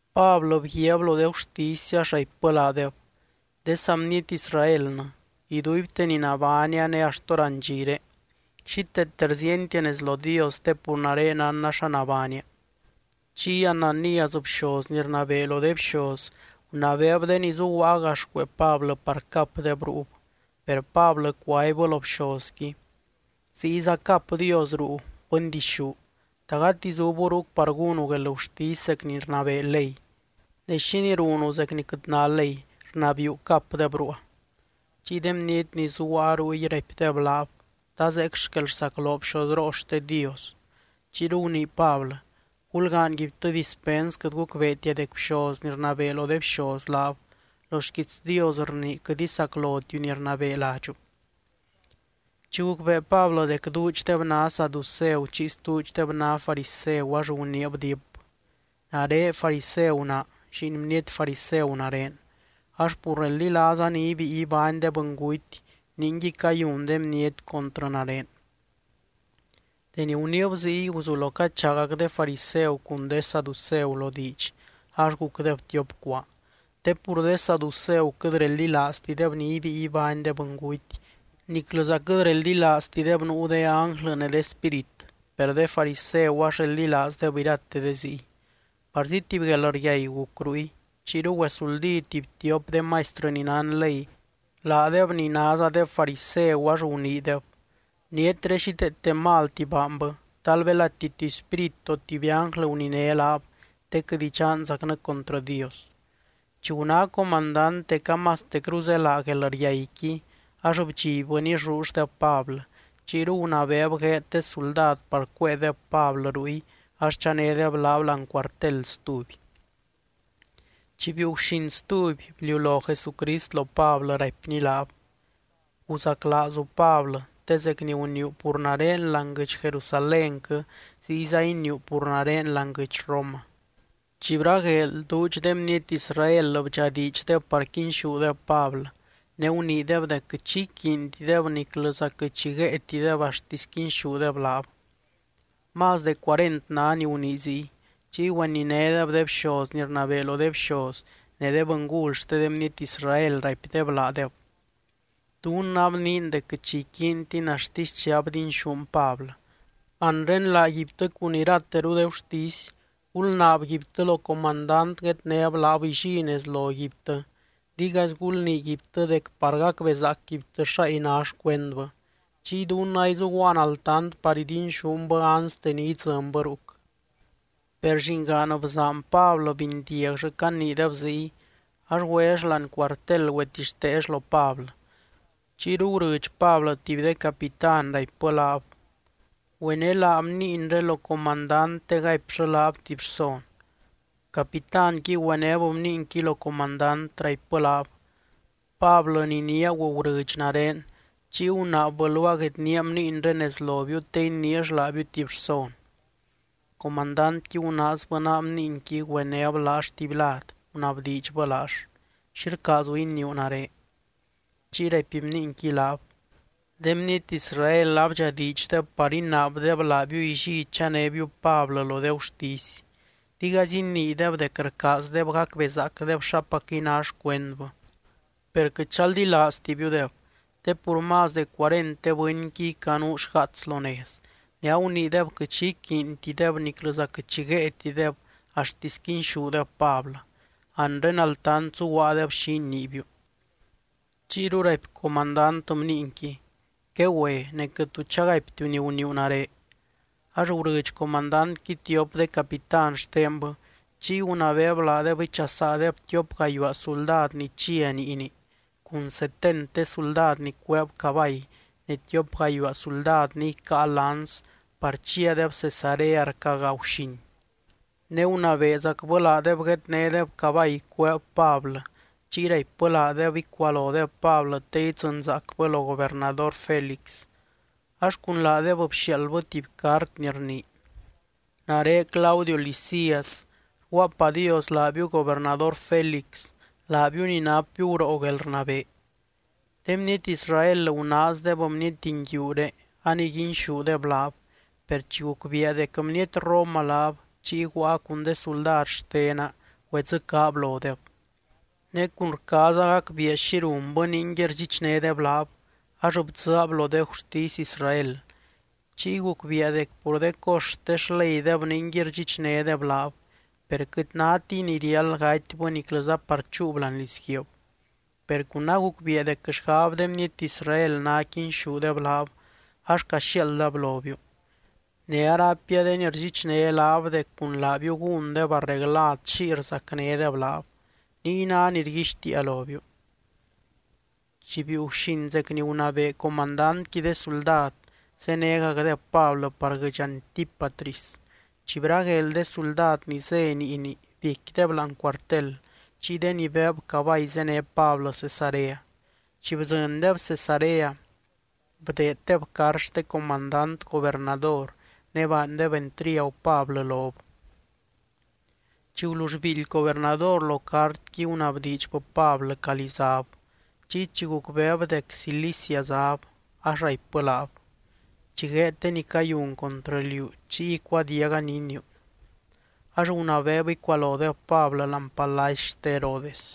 Pablɨ bguiaab lo de gurtisy, ax raipbɨ laadeb: —De saa bniety Israelnɨ, iduibte ni nabánia, ne axt hórandxire xíteete rziientia nez lo Dios te pur nare nánna xa nabánia. Chiy Ananías, bxoz ni rnabee lo de bxoz, gunabeeb de ni zuguaa gax cuee Pablɨ par capdeb ruub. Per Pablɨ cuaibbɨ lo bxozqui: —¡Ziyza cap Dios ruu, bɨndixú! ¿Ta gati zubu ruc par gúnu guelgurtisy zec ni rnabee ley? Ne, ¿xínii runu zec ni quɨt ná ley, rnabiiu capdeb ruua? Chiy de bniety ni zuguaa ruy raipdeb laab: —¿Ta zeec xquel rsacloo bxozroo xte Dios? Chiyru gunii Pablɨ: —Gulgaanyguibtɨ dispens, quɨt gucbeetia dec bxoz ni rnabee lo de bxoz laab. Lo xquiits Dios rnii: “Quɨt isaclotiu ni rnabee ladxu.” Chi gucbee Pablɨ dec duudxdeb ná saduceu chiy stuudxdeb ná fariseu, ax aguniib diip: —Nare fariseu naa, lliin bniety fariseu nare. Ax pur reldilaaza ni ibíi ibány de bɨnguty, ningui cayun de bniety contrɨ nare. Deni guniib ziy, guzulo cachaagac de fariseu cun de saduceu lo diidx, ax gucdeb tiop cuaa. Te pur de saduceu quɨt reldilaaztideb ni ibíi ibány de bɨnguty niclɨza quɨt reldilaaztideb nuu de ánglɨ ne de spírit, per de fariseu ax reldilaazdeb irate de ziy. Parzi tuby guelryai guc ruy. Chiyru güesuldí tuby tiop de maistrɨ ni nán ley, laadeb ni názadeb fariseu, ax guniideb: —Bnietré xíteete malti baanbɨ. Tal belati tuby spírit o tuby ánglɨ guniné laab, te quɨt idxanzacnɨ contrɨ Dios. Chi guná comandant dec amastecru zélaa guelryaiqui, ax bdxibbɨ nillulldeb Pablɨ. Chiyru gunabeeb gueed de suldad par cuéedeb Pablɨ ruy ax chanédeb laab láani cuartel stuby. Chi biiu guxin stuby, bliulo Jesucrist lo Pablɨ, raipny Pablɨ: —Guzaclaazu, Pablɨ, te zec ni guniiu pur nare láani guɨdx Jerusalénquɨ, ziyza iniiu pur nare láani guɨdx Roma. Chi bragueel, duudx de bniety Israel bdxadiidxdeb par quinxúdeb Pablɨ, ne guniideb dec quɨt xi iquiintideb niclɨza quɨt xi guéetideb axtisy quinxúdeb laab. Más de cuarent ná ni gunii ziy. Chiy güeninédeb de bxoz ni rnabee lo de bxoz ne de bɨngul xte de bniety Israel, raipdeb laadeb: —Dunnɨ abniin dec quɨt xi iquiintin axtisy chi abdinxún Pablɨ. Anre laaguibtɨ cun irateru de gurtisy, gulnaabguibtɨ lo comandant guednéb laab illí nez loguibtɨ, digaizy gulniiguibtɨ dec par gacbezaacguibtɨ xáy ná xcuendbɨ. Chiy dunnɨ aizuguaan altant par idinxúnbɨ anste ni idzɨnbɨ ruc. Per llingaan bzaan Pablɨ bindiagllɨ caniideb ziy, ax güell láani cuartel güetixteell lo Pablɨ. Chiyru gurɨdx Pablɨ tuby de capitán, raipbɨ laab: —Güenelaa bniinré lo comandant te gaipllɨ laab tuby rson. Capitánqui güenéb bniinqui lo comandant, raipbɨ laab: —Pablɨ ni niaagu gurɨdx nare, chiy gunaabbɨ luaa guednía bniinré nez lobiu te iniill laabiu tuby rson. Comandantqui gunaazbɨ naa bniinqui, güenéb laall tuby lad, gunabdiidxbɨ laall: —¿Xi rcaazu iniiu nare? Chiy raipy bniinqui laab: —De bniety Israel abdxadiidxdeb par inaabdeb laabiu illí chanébiu Pablɨ lo de gurtisy, digaizy iniideb dec rcaazdeb gacbezaacdeb xapacquɨy ná xcuendbɨ. Per quɨt chaldilaaztibiudeb, te pur más de cuarent de bɨnqui icanuu xgaats lo nez, ne aguniideb quɨt xi iquiintideb niclɨza quɨt xi guéetideb axtisy quinxúdeb Pablɨ. Anre altant zuguaadeb xi iniibiu. Chiyru raipy comandant bniinqui: —Quegüe. Ne quɨt tu chagaiptiu ni guniiu nare. Ax gurɨdx comandantqui tiop de capitán xtenbɨ, chiy gunabeeb laadeb ichasaadeb tiop gayuaa suldad ni chia niini, cun setent de suldad ni cueeb cabay ne tiop gayuaa suldad ni icáa lanz par chiadeb Cesarea rca gaa guxin. Ne gunabeezacbɨ laadeb guednédeb cabay cueeb Pablɨ, chiy raipbɨ laadeb icualodeb Pablɨ te idzɨnzaacbɨ lo gobernador Félix. Ax cun laadeb bxiaaldbɨ tuby cart ni rnii: “Nare Claudio Lisias, rguaapadios laabiu gobernador Félix, laabiu ni napbiu guroo guelrnabee. De bniety Israel gunaazdeb bniety nguiuré aniguinxúdeb laab, per chi gucbiia dec bniety Roma laab, chiy guaa cun de suldad xtena güedzɨcaab lodeb. Ne cun rcaaza gacbiia xi runbɨ ningui rdxichnédeb laab, ax bdzɨɨab lo de gurtisy Israel. Chiy gucbiia dec pur de cos xte xleydeb ningui rdxichnédeb laab, per quɨt nátiy ni riáld gatybɨ niclɨza par chúub láani lizguiib. Per cun agucbiia dec xgab de bniety Israel ná quinxúdeb laab, ax caxiaaldab lobiu. Ne araipia de ni rdxichné laab dec cun laabiu gúndeb arreglad xiy rzacnédeb laab. Niy ná ni rguixtiia lobiu.” Chi biiu guxin zec ni gunabee comandantqui de suldad, zénegacdeb Pablɨ par guɨdx Antípatris. Chi bragueel de suldad ni zé niini biecquideb láani cuartel, chiy de ni beeb cabay zéne Pablɨ Cesarea. Chi bdzɨndeb Cesarea, bdeeddeb cart xte comandant gobernador ne baandeb entriagu Pablɨ lob. Chi gulull biildy gobernador lo cartqui, gunabdiidxbɨ Pablɨ calí záb. Chiy chi gucbeeb dec Cilicia záb, ax araipbɨ laab: —Chi gueed de ni cayun contrɨ liú, chiy icuadiaga ni iniiu. Ax gunabeeb icualodeb Pablɨ láani palacy xte Herodes.